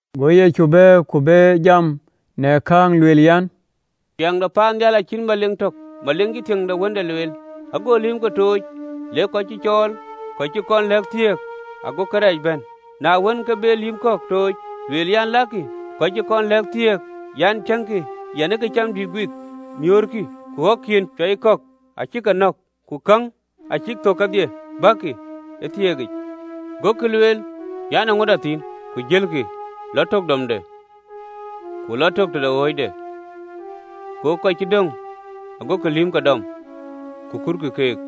Go Yecu bɛ̈ɛ̈r, ku be jam në kääŋ, lueel an, “Ciɛɛŋ de paannhial, acït melik tök, melik cï thiëŋ de wënde lueel, go lïïmke tooc lek kɔc cɔɔl kɔc cï kɔn lɛ̈k thiëëk, gokï rɛɛc bɛ̈n. Na wën, ke be lïïm kɔ̈k tooc, lueel an, “Lɛ̈kkï kɔc cï kɔn lɛ̈k thiëëk an, ‘Tiëŋkï, yɛn ë këcamdït guik, miöörkï ku ɣɔ̈kkiën cuai kɔ̈k acï ke nɔ̈k, ku käŋ acïk thök kedhie, bäkï ë thiëëkic!’ Gokï lueel an, “Eeŋöda thïn, ku jëlkï, lɔ tök domde, ku lɔ tök tëdɛn ë ɣööc, go kɔc cï döŋ gokï lïïmke dɔm, ku kurkï keek,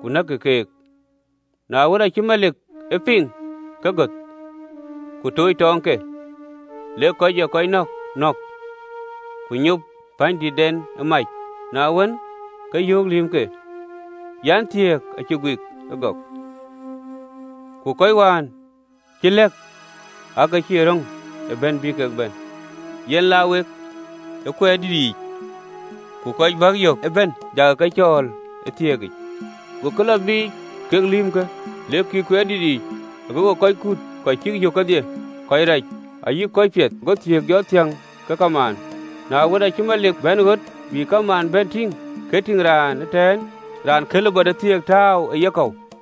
ku näkkï keek. Na wën, acï melik e piŋ, ke göth, go remdɛn ë tɔŋ tooc, lek kɔc ee kɔc nɔ̈kë nɔ̈k, ku nyop pänydɛndït ë mac. Na wën, ke yöök lïïmke an, “Thiëëk acï guik, ku kɔc wään cï lɛ̈k cïï röŋ ë bɛ̈n bï kek bɛ̈n. Yen la wek ë kuɛɛr dït yiic, ku kɔc bäk yök ëbɛ̈n, jakï ke cɔɔl ë thiëëkic. Agokï lɔ biic kek lïïmke, lekï ë kuɛɛr dït yiic, agokï kɔc kut kɔc cïk yök kedhie, kɔc rac ayï kɔc piɛth, go thiëëk jɔ thiäŋ ke kamaan. Na wën, acï melik bɛ̈n ɣöt bï kamaan bɛ̈n tïŋ, ke tïŋ raan ëtɛ̈ɛ̈n raan kën lupɔ de thiëëk tääu ë yekɔ̈u,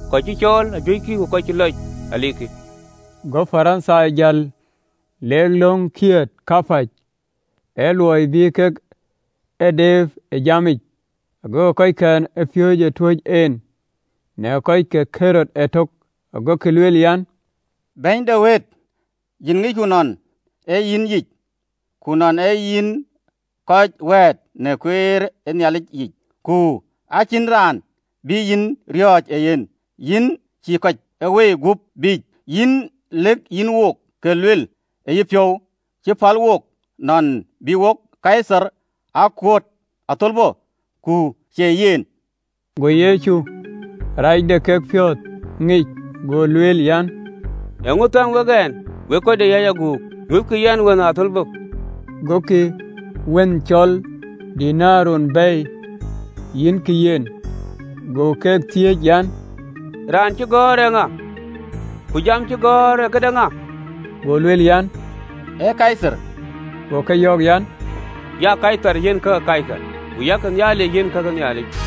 Kɔc cï cɔɔl ajuëckï, ku kɔc cï lɔc alikï. Go Parithai jäl lek löŋ kiëët kapäc ë luɔi bï kek ë deep ë jamic. Gokï kɔckɛn ë piööcë tuöc en, në kɔc ke Ɣerod ëtök, agokï lueel an, “Bɛ̈ny de wëët, yïn ŋicku nɔn ee yïn yic, ku nɔn ee yïn kɔc wɛ̈ɛ̈t në kueer ë Nhialic ë yic, ku acïn raan bï yïn riɔ̈ɔ̈c ë yen, yïn cïï kɔc ë woi gup biic. Yen lëk yïn wook, ke luel ë yïpiɔ̈u. Cï päl wook nɔn bï wok Kaithar aa kuöt athölbö, ku cie yen?” Go Yecu rac de kepiɔ̈ɔ̈th ŋic, go lueel an, “Eeŋö thɛm wek ɛn, wek kɔc de yäc aguk? Nyuöthkï yen wënh ye athölbö kut.” Gokï wënh cɔl denariɔn bɛ̈ɛ̈i yïnkï yen. Go keek thiëëc an, “Raan cï gɔ̈ɔ̈rë eeŋa, ku jam cï gɔ̈ɔ̈r ee këde ŋa?” Gokï bɛ̈ɛ̈r an, “Ee Kaithar.” Go ke yɔ̈ɔ̈k an, “Yak Kaithar yiɛ̈n ka ke Kaithar, ku yak Nhialic yiɛ̈n ka ke Nhialic.”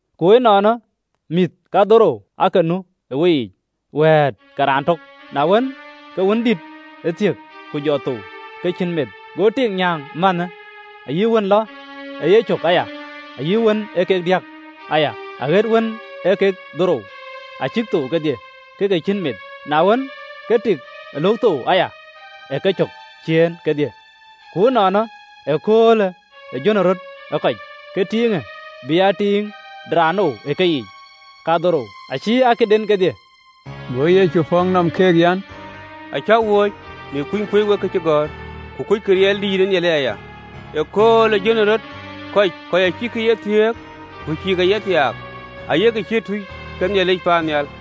Ku ënɔɔnë, mïth kadhorou aake nu ë woyiic, wɛ̈ɛ̈t ke raan tök, na wën, ke wën dït thiëk, ku jɔ thou, ke cïn meth, go tik nyäŋ mänhë. Ayï wën lɔ ë yecök aya, ayï wën ee kek diäk aya, aɣët wën ee kek dhorou, acïk thou kedhie, ke ke cïn mïth. Na wën, ke tik löök thou aya ë kecök ciëën kedhie. Ku ënɔɔnë, ëkööl ë jönërɔt ë kɔc, ke tiiŋë bï aa tiiŋ de raanou ë keyiic kadhorou? Acï aa këden kedhie.” Go Yecu pɔ̈k nɔm keek an, “Acäk wööc, në kuny kuöc wek kacïgɔ̈ɔ̈r, ku kuöckï riɛldïït ë Nhialic aya. Ë kööl ë jönërɔt ë kɔc, kɔc acïkï ye thiëëk, ku cïï ke ye thiaak, ayek ciët tuuc ke Nhialic paannhial.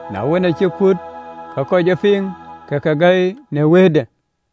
Na wën, acï kuut ke kɔc e piŋ, ke ke gäi në wëëtde.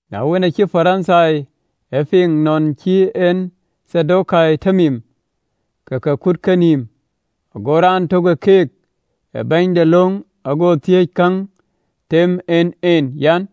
Na wën, aacï Parithai e piŋ nɔn cï en Thadokai tɔ mim, ke ke kut kenïïm. Go raan tök ë keek, ee bɛ̈ny de löŋ, go thiëc käŋ, them en en an,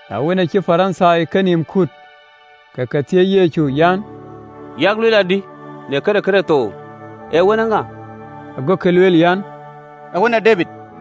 Na wën, aacï Parithai kenïïm kut, ke ke thiëëc Yecu keek, an, “Eeŋö yak lueel në biäk de Kërtho? Ee wën ë ŋa?” Gokï lueel an, “Ee wën ë Debid.”